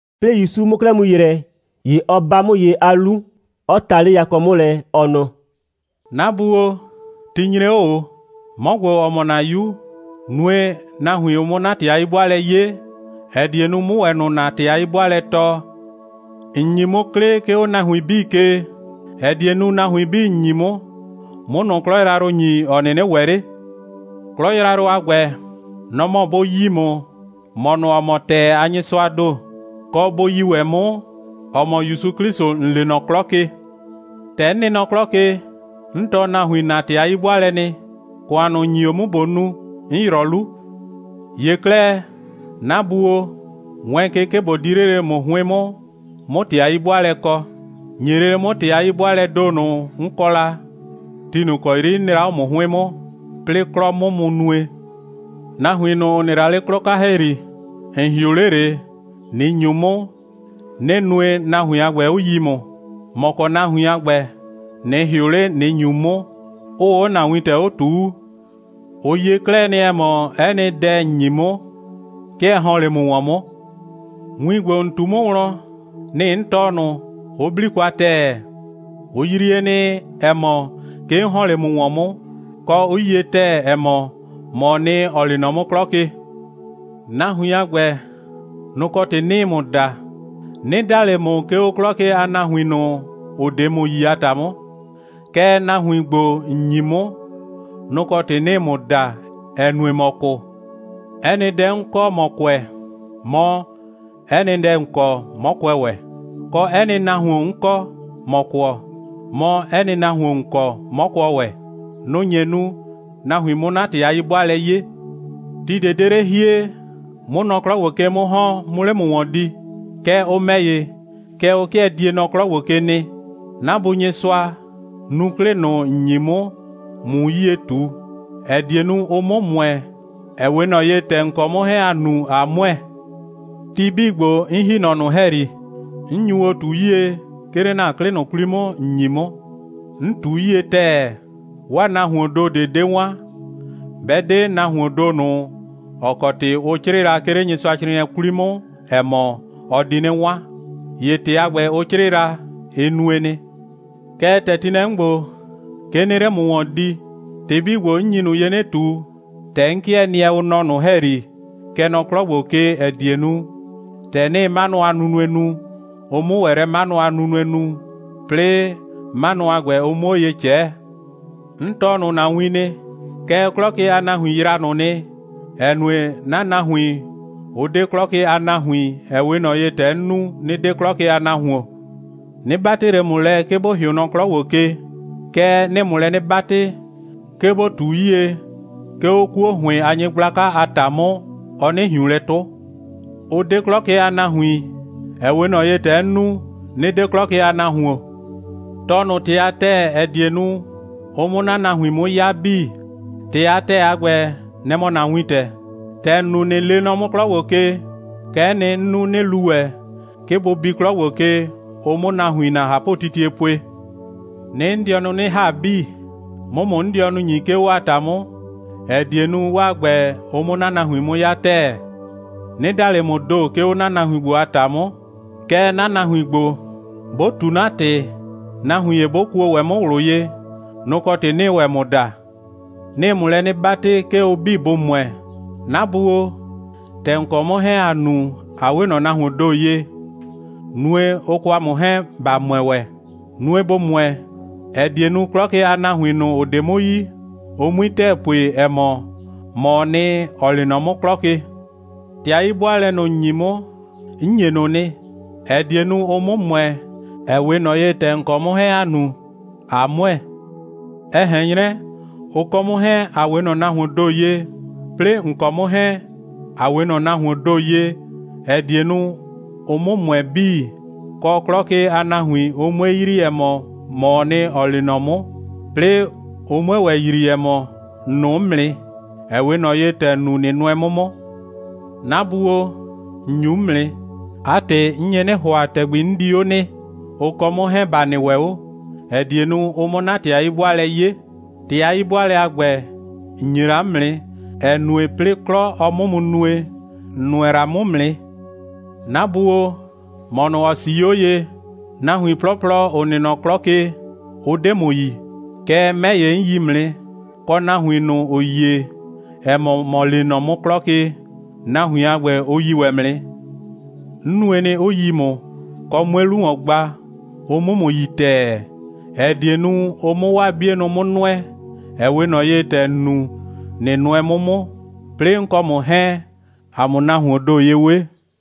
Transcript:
'Plɩɩ ‑Yusu 'mʋ 'klɛɛ mu ‑yrɛ, ‑ye ɔ 'ba 'mʋ ye 'a 'lu, 'ɔ ta 'le yakɔ 'mʋ lɛ, ɔ nɔ: «'Na Bu o, ti nyre 'o ꞊o. 'Mɔ ‑gbo, ‑ɔ mɔ ‑na 'Yu, nue, nahuin, ʋ 'mʋ 'na ‑tɩ a 'yi'bʋaalɛ 'ye, ‑ɛ die nu, 'mʋ ‑wɛ ꞊nʋ ‑na ‑tɩ a 'yi'bʋaalɛ tɔɔ. ‑N ‑nyi 'mʋ 'klɩ, 'ke 'o nahuin 'bii ke, ‑ɛ die nu, nahuin 'bii, ‑n ‑nyi 'mʋ, 'mʋ ꞊nʋ 'klɔ yrayrʋ ‑nyi, ‑ɔ 'nɩnɩ ‑wɛ 'le. 'Klɔ yrayrʋ a ‑gbɛ, nɔ‑ mɔ bʋ yi ‑mʋ, ‑mɔ ꞊nʋ, ‑ɔ mɔ ‑tɛɛ a Nyɩsʋaa ‑do, kɔ, bʋ yi ‑wɛ 'mʋ, ‑ɔ mɔ ‑Yusu 'Klɩsʋ, ‑n lee nɔ 'klɔ ke. ‑Tɛ 'n nɩ nɔ 'klɔ ke, 'n tɔɔ nahuin ‑na ‑tɩ a 'yi'bʋaalɛ nɩ. ‑Kʋan ꞊nʋ, ‑n ‑nyi o 'mʋ, ꞊bo nu, 'n ‑yrɔ 'lu. ‑Ye 'klɛɛ, 'na Bu o, wɛɛn ke, 'ke ꞊bo 'di 'le lele ‑mʋ 'hʋɩn 'mʋ, 'mʋ ‑tɩ a 'yi'bʋaalɛ kɔ. ‑Nye lele 'mʋ ‑tɩ a 'yi'bʋaalɛɛ ‑do ꞊nʋ, 'n kɔ la, ti ꞊nʋ ‑kɔ 'yri 'n nɩ la 'o ‑mʋ 'hʋɩn 'mʋ, 'plɩɩ 'klɔ 'mʋ mu nue. Nahuin ꞊nʋ, ‑ʋ nɩ la 'le 'klɔ 'ka ‑hɛyri, ‑n ‑hɩʋ 'le ꞊le, ꞊nɩ ‑nyu 'mʋ, 'nɩ nue, nahuin a ‑gbɛ, 'ʋ yi ‑mʋ. ‑Mɔ kɔ nahuin a ‑gbɛ, ꞊nɩ ‑hɩʋ 'le, ꞊nɩ ‑nyu 'mʋ, 'ʋʋ 'o ‑na wintɛ 'o ꞊tuu. Ʋ yie 'klɛɛ nɩ, ‑ɛ mɔ, 'ɛ nɩ dɛ, ‑n ‑nyi 'mʋ, 'ke ɛ ‑hɔn 'le ‑mʋ ‑wɔn 'mʋ. Win ‑gbo, ‑n ꞊tu 'mʋ wlɔn, nɩ‑ 'n tɔɔ ꞊nʋ, 'ʋ 'bli kwa ‑tɛɛ. Ʋ yrie nɩ, ‑ɛ mɔ, 'ke 'n ‑hɔn 'le ‑mʋ ‑wɔn 'mʋ, kɔ, 'ʋ yie ‑tɛɛ, ‑ɛ mɔ, ‑mɔɔ nɩ, ‑ɔ lee nɔ 'mʋ 'klɔ ke. Nahuin a ‑gbɛ, nʋ‑ kɔ ‑tɩ 'nɩɩ ‑mʋ da. 'Nɩ da ꞊le ‑mʋ, 'ke 'o 'klɔ ke a nahuin ꞊nʋ, ‑ʋ 'de ‑mʋ yi a ‑ta 'mʋ. Kɛɛ, nahuin ‑gbo, ‑n ‑nyi 'mʋ, nʋ‑ kɔ ‑tɩ 'nɩɩ ‑mʋ da, ‑ɛ nue, ‑mɔ kʋ. 'Ɛ nɩ dɛ, 'n kɔ, ‑mɔ kʋɛ, mɔ, 'ɛ nɩ dɛ, ‑n kɔ, 'mɔ kʋɛ ‑wɛ, kɔ, 'ɛ nɩ nahuon, 'n kɔ, ‑mɔ kʋɔ, mɔ, 'ɛ nɩ nahuon, ‑n kɔ, 'mɔ kʋɔ ‑wɛ. Nʋ‑ nye nu, nahuin 'mʋ 'na ‑tɩ a 'yi'bʋaalɛ 'ye. Ti ꞊de 'de 'le hie, 'mʋ nɔ 'klɔ ‑gbo ke 'mʋ ‑hɔn, 'mʋ 'le ‑mʋ ‑wɔn di. Kɛɛ, ʋ ‑mɛ ‑ye, kɛ ʋ 'kɩɛ die nɔ 'klɔ ‑gbo ke nɩ. 'Na Bu Nyɩsʋa, nu 'klɩ ꞊nʋ, ‑n ‑nyi 'mʋ, ꞊mu 'yie ꞊tu, ‑ɛ die nu, ʋ 'mʋ ‑mʋɛ, ‑ɛ 'we ꞊nɔ ye, ‑tɛ ‑n kɔ 'mʋ 'hɛɛn ‑a nu, ꞊a ‑mʋɛ. Ti 'bii ‑gbo, 'n ‑hi nɔ ꞊nʋ ‑hɛyri, 'n nyu o ꞊tu 'yie, 'ke 'le ‑na 'klɩ ꞊nʋ 'kwli 'mʋ, ‑n ‑nyi 'mʋ. 'N ꞊tu 'yie ‑tɛɛ, 'waa nahuoon ‑do ꞊de 'ɔ 'de 'wan, 'bɛ 'de nahuoon ‑do ꞊nʋ, ‑ɔ kɔ ‑tɩ ʋ 'crɩɩ la, 'ke 'le Nyɩsʋacrɩɩnɩɛ 'kwli 'mʋ, ‑ɛ mɔ, ɔ di 'nɩ 'wan. ‑Ye ‑tɩ a ‑gbɛ, ʋ 'crɩɩ la, ɩ nue nɩ. Kɛɛ, ‑tɛ ti nɩ lɛ 'mʋ ‑gbo, 'ke 'nɩɩ 'le ‑mʋ ‑wɔn di. ‑Tɩ 'bii ‑gbo, 'n nyi ꞊nʋ ye 'nɩ ꞊tu, ‑tɛ 'n 'kɩɛ nɩɛ nɔ ꞊nʋ ‑hɛyri, kɛ nɔ 'klɔ ‑gbo ke, ‑ɛ die nu, ‑tɛ 'nɩɩ 'manʋ a nunue nu, ʋ 'mʋ ‑wɛ lɛ 'manʋ a nunue nu, 'plɩɩ 'manʋ a ‑gbɛ, ʋ 'mʋ 'o ye ꞊cɛɛ. 'N tɔɔ ꞊nʋ ‑na win nɩ, kɛɛ, 'klɔ ke a nahuin yraa ꞊nʋ nɩ, ‑ɛ nue, 'na nahuin, ʋ 'de 'klɔ ke a nahuin, ‑ɛ 'we ꞊nɔ ye, ‑tɛ 'n nu, 'nɩ 'de 'klɔ ke a nahuon. 'Nɩ 'batɩ ꞊le ‑mʋ lɛ, 'ke ‑bo ‑hɩʋ nɔ 'klɔ ‑gbo ke, kɛɛ, 'nɩɩ ‑mʋ lɛ 'nɩ 'batɩ, 'ke ‑bo ꞊tu 'yie, 'ke 'o 'kuo ‑hʋɩn a nyɩgblaka a ‑ta 'mʋ, ɔ 'nɩ ꞊hiun lɛ 'tʋ. Ʋ 'de 'klɔ ke a nahuin, ‑ɛ 'we ꞊nɔ ye, ‑tɛ 'n nu, 'nɩ 'de 'klɔ ke a nahuon. Tɔɔ ꞊nʋ ‑tɩ a ‑tɛɛ, ‑ɛ die nu, ʋ 'mʋ ‑na nahuin 'mʋ 'ya 'bii. ‑Tɩ a ‑tɛɛ a ‑gbɛ, nɛ‑ mɔ ‑na wintɛ. ‑Tɛ ‑n nu, ꞊nɩ lee nɔ 'mʋ 'klɔ ‑gbo ke, kɛ'ɛ nɩ, 'n nu, 'nɩ lu ‑wɛ, 'ke bʋ bi 'klɔ ‑gbo ke, ʋ 'mʋ nahuin ‑na ꞊hapʋtitie pue. 'Nɩɩ 'n dɩɔnʋ 'nɩ ‑ha 'bii, 'mʋ ‑mʋ 'n dɩɔnʋ ‑nyi, 'ke 'o 'waa ‑ta 'mʋ, ‑ɛ die nu, 'waa ‑gbɛ, ʋ 'mʋ ‑na nahuin 'mʋ 'ya ‑tɛɛ. 'Nɩ da ꞊le ‑mʋʋ ‑do, 'ke 'o 'na nahuin ‑gbo a ‑ta 'mʋ. Kɛɛ, 'na nahuin ‑gbo, 'bʋ ꞊tu 'na ‑tɩ, nahuin ‑ye 'bʋ kuo ‑wɛ 'mʋ ꞊wlʋ ye, nʋ‑ kɔ ‑tɩ 'nɩɩ ‑wɛ ‑mʋ da. 'Nɩɩ ‑mʋ lɛ 'nɩ 'batɩ, 'ke ʋ 'bii bʋ ‑mʋɛ. 'Na Bu o, ‑tɛ ‑n kɔ 'mʋ 'hɛɛn, ‑a nu, ꞊a 'we ꞊nɔ nahuoon ‑do ye, nue, ʋ kɔ ‑a mʋ 'hɛɛn, ‑ba ‑mʋɛ ‑wɛ. Nue, bʋ ‑mʋɛ, ‑ɛ die nu, 'klɔ ke a nahuin ꞊nʋ, ‑ʋ 'de ‑mʋ yi, ʋ 'mui ‑tɛɛ pue, ‑ɛ mɔ, ‑mɔɔ nɩ, ‑ɔ lee nɔ 'mʋ 'klɔ ke. ‑Tɩ a 'yi'bʋaalɛ ꞊nʋ, ‑n ‑nyi 'mʋ, 'n ‑nye ꞊nʋ nɩ, ‑ɛ die nu, ʋ 'mʋ ‑mʋɛ, ‑ɛ 'we ꞊nɔ ye, ‑tɛ ‑n kɔ 'mʋ 'hɛɛn, ‑a nu, ꞊a ‑mʋɛ, ɛ ꞊hɛn 'nyrɛ, ʋ kɔ 'mʋ 'hɛɛn, ‑a 'we ꞊nɔ nahuoon ‑do ye, 'plɩɩ ‑n kɔ 'mʋ 'hɛɛn, ‑a 'we ꞊nɔ nahuoon ‑do ye, ‑ɛ die nu, ʋ 'mʋ ‑mʋɛ 'bii, kɔ, 'klɔ ke a nahuin, ʋ 'mue yrii, ‑ɛ mɔ, ‑mɔɔ nɩ, ‑ɔ lee nɔ 'mʋ, 'plɩɩ ʋ 'mue ‑wɛ yrii, ‑ɛ mɔ, ‑n nʋʋ 'mʋ nɩ, ‑ɛ 'we ꞊nɔ ye, ‑tɛ ‑n nu, ꞊nɩ nʋɛ 'mʋ 'mʋ. 'Na Bu o, ‑n ‑nyu 'mʋ nɩ. 'A ‑tɩ, 'n nye 'nɩ ‑hʋa, ‑tɛgbi 'n di 'o nɩ, ʋ kɔ 'mʋ 'hɛɛn, ‑ba nɩ ‑wɛ 'o, ‑ɛ die nu, ʋ 'mʋ 'na ‑tɩ a 'yi'bʋaalɛ 'ye. ‑Tɩ a 'yi'bʋaalɛ a ‑gbɛ, ‑n ‑nye la 'mʋ nɩ, ‑ɛ nue, 'plɩɩ 'klɔ, ɔ 'mʋ mu nue, ‑n nʋɛ la 'mʋ 'mʋ nɩ. 'Na Bu o, ‑mɔ ꞊nʋ, ‑ɔ 'sii 'o ye, nahuin 'plɔplɔ, ‑ʋ nɩ nɔ 'klɔ ke, ʋ 'de ‑mʋ yi. Kɛɛ, 'mɛ ‑ye, 'n yi ‑mʋ nɩ, kɔ, nahuin ꞊nʋ, ‑ʋ yie, ‑ɛ mɔ, ‑mɔ lee nɔ 'mʋ 'klɔ ke, nahuin a ‑gbɛ, ʋ yi ‑wɛ ‑mʋ nɩ. 'N nue nɩ, 'ʋ yi ‑mʋ, kɔ, 'mue 'lu ‑wɔn gba, ʋ 'mʋ ‑mʋ yi ‑tɛɛ, ‑ɛ die nu, ʋ 'mʋ 'waa 'bienʋ 'mʋ nʋɛ, ‑ɛ 'we ꞊nɔ ye, ‑tɛ ‑n nu, ꞊nɩ nʋɛ 'mʋ 'mʋ, 'plɩɩ 'n kɔ ꞊nʋ 'hɛɛn, ‑a 'mʋ nahuoon ‑do ye 'we.»